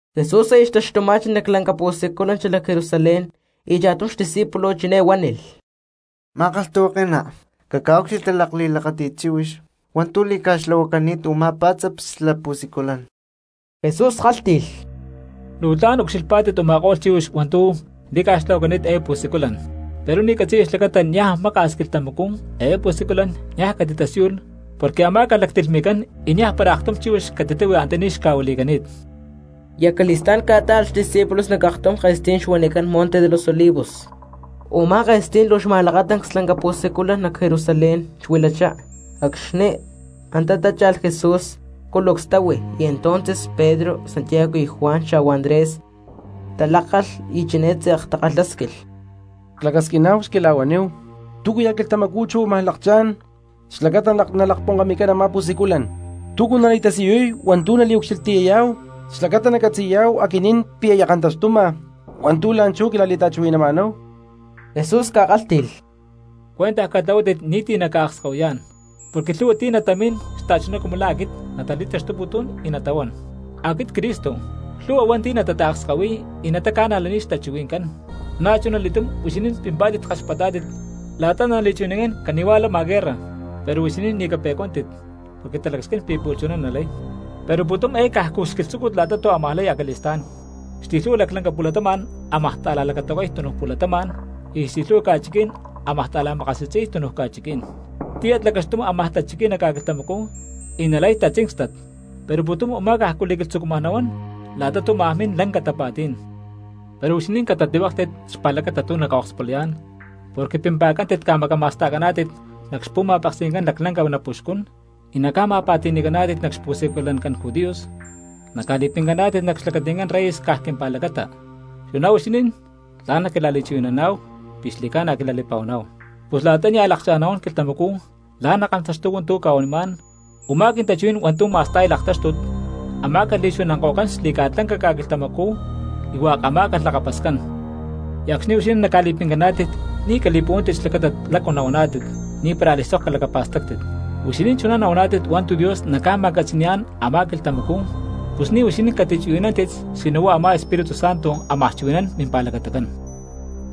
Jesús aya xtaxtuma̠chi nac lanca pu̠siculan xalac Jerusalén y cha̠tum xdiscípulo chiné huánilh: —Ma̠kalhtahuake̠ná, caca̠úcxilhti lakli̠lakáti̠t chíhuix hua̠ntu̠ li̠ca̠xtlahuacani̠t u̠má pá̠tzaps xla pu̠siculan. Jesús kálhti̠lh: —Luu tla̠n ucxílhpa̠t u̠ma̠ko̠lh chíhuix hua̠ntu̠ li̠ca̠xtlahuacani̠t eé pu̠siculan, pero ni̠ catzi̠ya xlacata niaj maka̠s quilhtamacú eé pu̠siculan niaj catitasíyulh porque amá̠calh lactilhmi̠cán y niaj para aktum chíhuix catitahui antaní xca̠huili̠cani̠t. Y acali̠stá̠n ca̠tá̠alh xdiscípulos nac aktum ke̠stí̠n huanicán Monte de los Olivos. Umá ke̠stí̠n luu xma̠lakatancs lanca pu̠siculan nac Jerusalén xuilachá. Acxni̠ antá tácha̠lh Jesús culucs táhui, y entonces Pedro, Santiago, Juan xa̠hua Andrés talákalh y chiné tze̠k takalhásquilh: —Clacasquiná̠hu xquila̠huaníhu túcuya̠ quilhtamacú chuná amaj lakchá̠n xlacata nalakponkami̠cán a̠má pu̠siculan. ¿Túcu nali̠tasiyuy hua̠ntu̠ naliucxilhtiyayá̠hu xlacata nacatzi̠yá̠hu aquinín pi̠ aya kantaxtuma hua̠ntu̠ la̠nchú quila̠li̠ta̠chuhui̠nama̠náhu? Jesús ca̠kálhti̠lh: —Cuentaj catlahuátit ni̠ti̠ naca̠akskahuiyá̠n. Porque lhu̠hua ti̠ natamín xta̠chuná cumu la̠ aquit natali̠taxtuputún, y natahuán: “Aquit Cristo”, lhu̠hua hua̠nti̠ natataakskahuiy y nataca̠najlaniy xtachuhui̠ncán. Na̠chunali̠túm huixinín pimpá̠tit kaxpatá̠tit la̠ta nali̠chuhui̠nancán cani̠huá talamá̠nalh guerras, pero huixinín ni̠ cape̠cuántit porque talacasquín pi̠ pu̠lh chuná nalay. Pero pu̠tum eé cajcu xquilhtzúcut la̠ta tu̠ ámaj lay acali̠stá̠n. Xli̠lhu̠hua laclanca pu̠latama̠n ámaj ta̠la̠lacatahuacay tunu pu̠latama̠n, y xli̠lhu̠hua ca̠chiquí̠n ámaj ta̠la̠makasi̠tzi̠y tunu ca̠chiquí̠n. Tíyat lacaxtum amaj tachiquiy nac ca̠quilhtamacú y nalay tatzíncstat. Pero pu̠tum u̠má cajcu li̠quilhtzucuma nahuán la̠ta tu̠ ámaj min lanca tapa̠tí̠n. ’Pero huixinín catatlihuéklhtit xpa̠lacata tu̠ naca̠okspulayá̠n porque pimpa̠cántit ca̠macama̠sta̠caná̠tit nac xpu̠ma̠peksi̠ncán laclanca napuxcún, y naca̠ma̠pa̠ti̠ni̠caná̠tit nac xpu̠siculancán judíos, naca̠li̠pincaná̠tit nac xlacati̠ncán reyes caj quimpa̠lacata; chuná huixinín tla̠n naquila̠li̠chuhui̠naná̠hu pi̠ xli̠ca̠na quila̠li̠pa̠huaná̠hu. Pus la̠ta nia̠ lakchá̠n nahuán quilhtamacú la̠ nakantaxtuy hua̠ntu̠ cca̠huanimá̠n u̠má quintachuhuí̠n hua̠ntu̠ ma̠sta̠y laktáxtut amá̠calh li̠chuhui̠nanko̠cán xli̠ca̠lanca ca̠quilhtamacú y hua̠k amá̠calh lakapascán. Y acxni̠ huixinín naca̠li̠pincaná̠tit, ni̠ cali̠puhuántit xlacata lácu nahuaná̠tit, ni̠para a̠li̠sok calacapa̠stáctit. Huixinín chuná nahuaná̠tit hua̠ntu̠ Dios naca̠ma̠catzi̠ni̠yá̠n a̠má quilhtamacú, pus ni̠ huixinín catichuhui̠nántit sino huá a̠má Espíritu Santo ámaj chuhui̠nán mimpa̠lacatacán.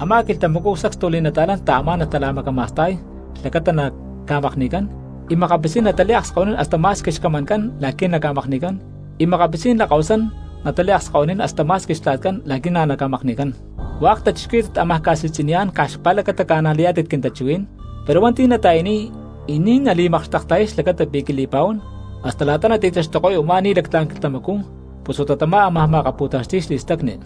Amá quilhtamacú sacstu li̠nata̠lán taamá̠nalh tala̠macama̠sta̠y xlacata naca̠makni̠cán, y makapitzí̠n nataliakskahuinín hasta ma̠squi xcamancán la̠qui̠ naca̠makni̠cán, y makapitzí̠n lakahuasán nataliakskahuinín hasta ma̠squi xtla̠tcán la̠qui̠ na̠ naca̠makni̠cán. Hua̠k cristianos ámaj ca̠si̠tzi̠niyá̠n caj xpa̠lacata ca̠najlayá̠tit quintachuhuí̠n, pero hua̠nti̠ nata̠yaniy y ni̠ nali̠makxtekta̠yay xlacata pi̠ quili̠pa̠huán hasta la̠ta nati̠taxtuko̠y u̠má ni̠lactlá̠n quilhtamacú pus huá tamá ámaj ma̠akapu̠taxti̠y xli̠stacni.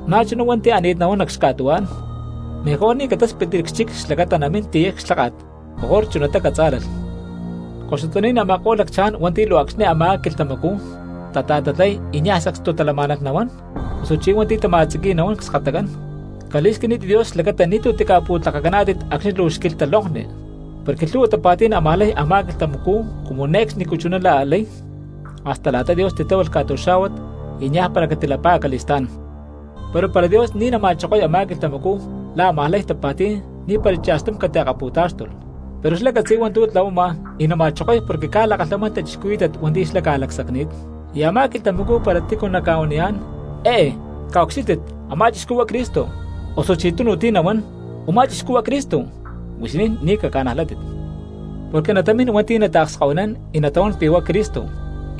Na̠chuná hua̠nti̠ ani̠t nahuán nac xca̠tuhuá̠n, mejor ni̠ catáspitli cxchic xlacata namín tiyay clháka̠t, mejor chunatá catzá̠lalh. ¡Koxutaní̠n a̠ma̠ko̠lh lacchaján hua̠nti̠ luu acxni̠ amá quilhtamacú tata̠tatlay y niaj sacstu talamá̠nalh nahuán, osuchí hua̠nti̠ tama̠tziqui̠y nahuán cskatacán! Cali̠squinítit Dios xlacata ni̠tu̠ tica̠pu̠tlakacaná̠tit acxni̠ luu xquilhta lonkni, porque lhu̠hua tapa̠tí̠n ámaj lay a̠má quilhtamacú cumu ne̠cxnicú chuná a̠ lay hasta la̠ta Dios titláhualh ca̠tuxá̠huat, y niaj para catilapá acali̠stá̠n. Pero para Dios ni̠ nama̠chokoy a̠má quilhtamacú la̠ ámaj lay tapa̠tí̠n ni̠para cha̠stum catiakapu̠táxtulh; pero xlá catzi̠y hua̠ntu̠ tlahuama y nama̠chokoy porque ca̠lakalhamán cristianos hua̠nti̠ xlá ca̠lacsacni̠t. ’Y a̠má quilhtamacú para tícu naca̠huaniyá̠n: “Eé caucxílhtit, a̠má chixcú huá Cristo”, osuchí tunu ti̠ nahuán: “Umá chixcú huá Cristo”, huixinín ni̠ caca̠najlátit. Porque natamín hua̠nti̠ nataakskahuinán y natahuán pi̠ huá Cristo,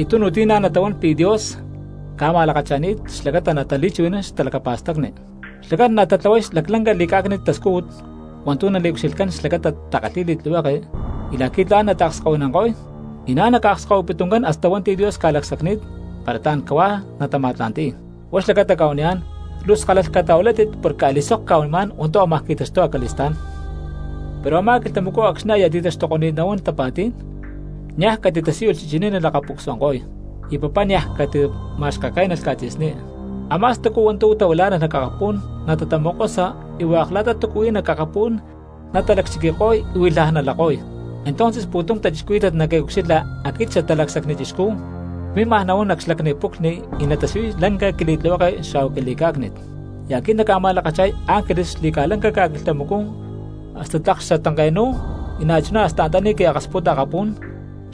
y tunu ti̠ natahuán pi̠ Dios ca̠ma̠lakacha̠ni̠t xlacata natali̠chuhui̠nán xtalacapa̠stacni. Xlacán natatlahuay laclanca li̠cá̠cni̠t tascújut hua̠ntu̠ naliucxilhcán xlacata takalhíy li̠tlihueke, y la̠qui̠ tla̠n natatakskahuinanko̠y; y na̠ naca̠akskahuiputún hasta hua̠nti̠ Dios ca̠lacsacni̠t para tla̠n cahuá natama̠tla̠nti̠y. Huá xlacata cca̠huaniyá̠n, luu skálalh catahuilátit porque a̠li̠sok cca̠huanimá̠n hua̠ntu̠ ámaj qui̠taxtuy acali̠stá̠n. ’Pero a̠má quilhtamacú acxni̠ aya ti̠taxtuko̠ni̠t nahuán tapa̠tí̠n, niaj catitasíyulh chichiní nalaca̠pucsuanko̠y; y papá niaj catima̠xkakénalh ca̠tzi̠sní. Amá stacu hua̠ntu̠ tahuilá̠nalh nac akapú̠n natatamokosa y hua̠k la̠ta tu̠ huí nac akapú̠n natalacchiquiko̠y y huilhaj nalako̠y. Entonces pu̠tum cristianos naquintaucxilha aquit Xatalacsacni Chixcú y cmímaj nahuán nac xlacni puclhni y natasiyuy lanca quili̠tlihueke xa̠hua quili̠cá̠cni̠t. Y aquit nacca̠ma̠lakacha̠y ángeles xli̠ca̠lanca ca̠quilhtamacú hasta tlak xatanke̠nu̠y, y na̠chuná hasta antaní qui̠akasputa akapú̠n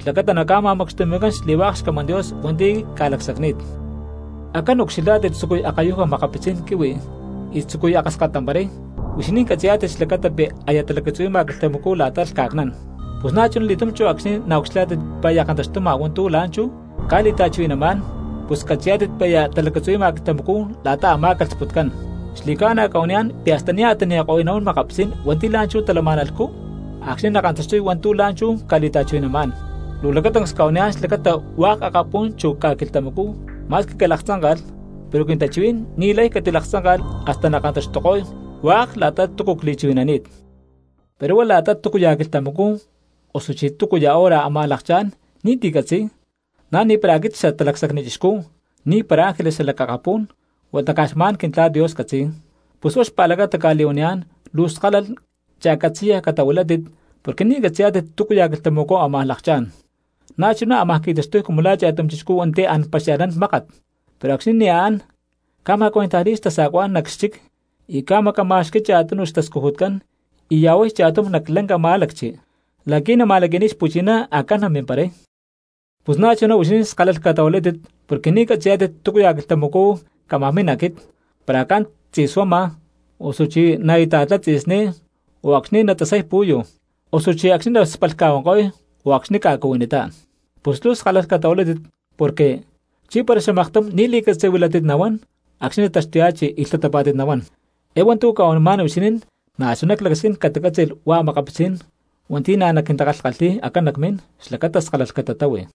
xlacata naca̠ma̠macxtumi̠cán xli̠hua̠k xcamán Dios hua̠nti̠ ca̠lacsacni̠t. ’Acán ucxilhá̠tit tzucuy akayuja makapitzí̠n quihui y tzucuy akaskatamparay, huixinín catzi̠yá̠tit xlacata pi̠ aya talacatzuhui̠ma quilhtamacú la̠ta lhca̠cnán. Pus na̠chuna li̠túm acxni̠ naucxilhá̠tit pi̠ aya kantaxtuma hua̠ntu̠ la̠nchú cca̠li̠ta̠chuhui̠namá̠n, pus cacatzí̠tit pi̠ aya talacatzuhui̠ma quilhtamacú la̠ta amá̠calh sputcán. Xli̠ca̠na cca̠huaniyá̠n pi̠ hasta nia̠ tani̠ko̠y nahuán makapitzí̠n hua̠nti̠ la̠nchú talama̠nalhcú acxni̠ nakantaxtuy hua̠ntu̠ la̠nchú cca̠li̠ta̠chuhui̠namá̠n. Luu lacatancs cca̠huaniyá̠n xlacata hua̠k akapú̠n chu ca̠quilhtamacú ma̠squi calaktzánka̠lh, pero quintachuhuí̠n ni̠lay catilaktzánka̠lh hasta nakantaxtuko̠y hua̠k la̠ta tu̠ cli̠chuhui̠nani̠t. ’Pero huá la̠ta túcuya̠ quilhtamacú osuchí túcuya̠ hora amaj lakchá̠n ni̠ti̠ catzi̠y, na̠ ni̠para aquit Xatalacsacni Chixcú, ni̠para ángeles xalac akapú̠n, huata caj xma̠n Quintla̠t Dios catzi̠y. Pus huá xpa̠lacata cca̠li̠huaniyá̠n luu skalalh y cha̠catzi̠ya catahuilátit porque ni̠ catzi̠yá̠tit túcuya̠ quilhtamacú ámaj lakchá̠n. Na̠chuná ámaj qui̠taxtuy cumu la̠ cha̠tum chixcú hua̠nti̠ an paxia̠lhnán mákat, pero acxni̠ nia̠ an, ca̠ma̠cuentajli̠y xtasa̠cuá̠n nac xchic y ca̠macama̠xqui̠y cha̠tunu xtascujutcán, y ya̠huay cha̠tum nac lanca má̠lacchi la̠qui̠ nama̠laqui̠niy xpu̠chiná acán namimparay. Pus na̠chuná huixinín skálalh catahuilátit porque ni̠ catzi̠yá̠tit túcuya̠ quilhtamacú cámaj min aquit, para acán tzi̠suama, osuchí la̠ naita̠tlay tzi̠sní, o acxni̠ natasay pu̠yu, osuchí acxni̠ naspalhca̠huanko̠y, o acxni̠ ca̠cuhuinitá. Pus luu skálalh catahuilátit porque, ¿chí para xamaktum ni̠ li̠catzi̠huilátit nahuán acxni̠ nactaxtuya̠chi y lhtatapá̠tit nahuán? Eé hua̠ntu̠ cca̠huanimá̠n huixinín na̠chuná clacasquín catacátzi̠lh hua̠k a̠makapitzí̠n cristianos hua̠nti̠ naquintakalhkalhíy acán nacmín, xlacata skálalh catatáhui.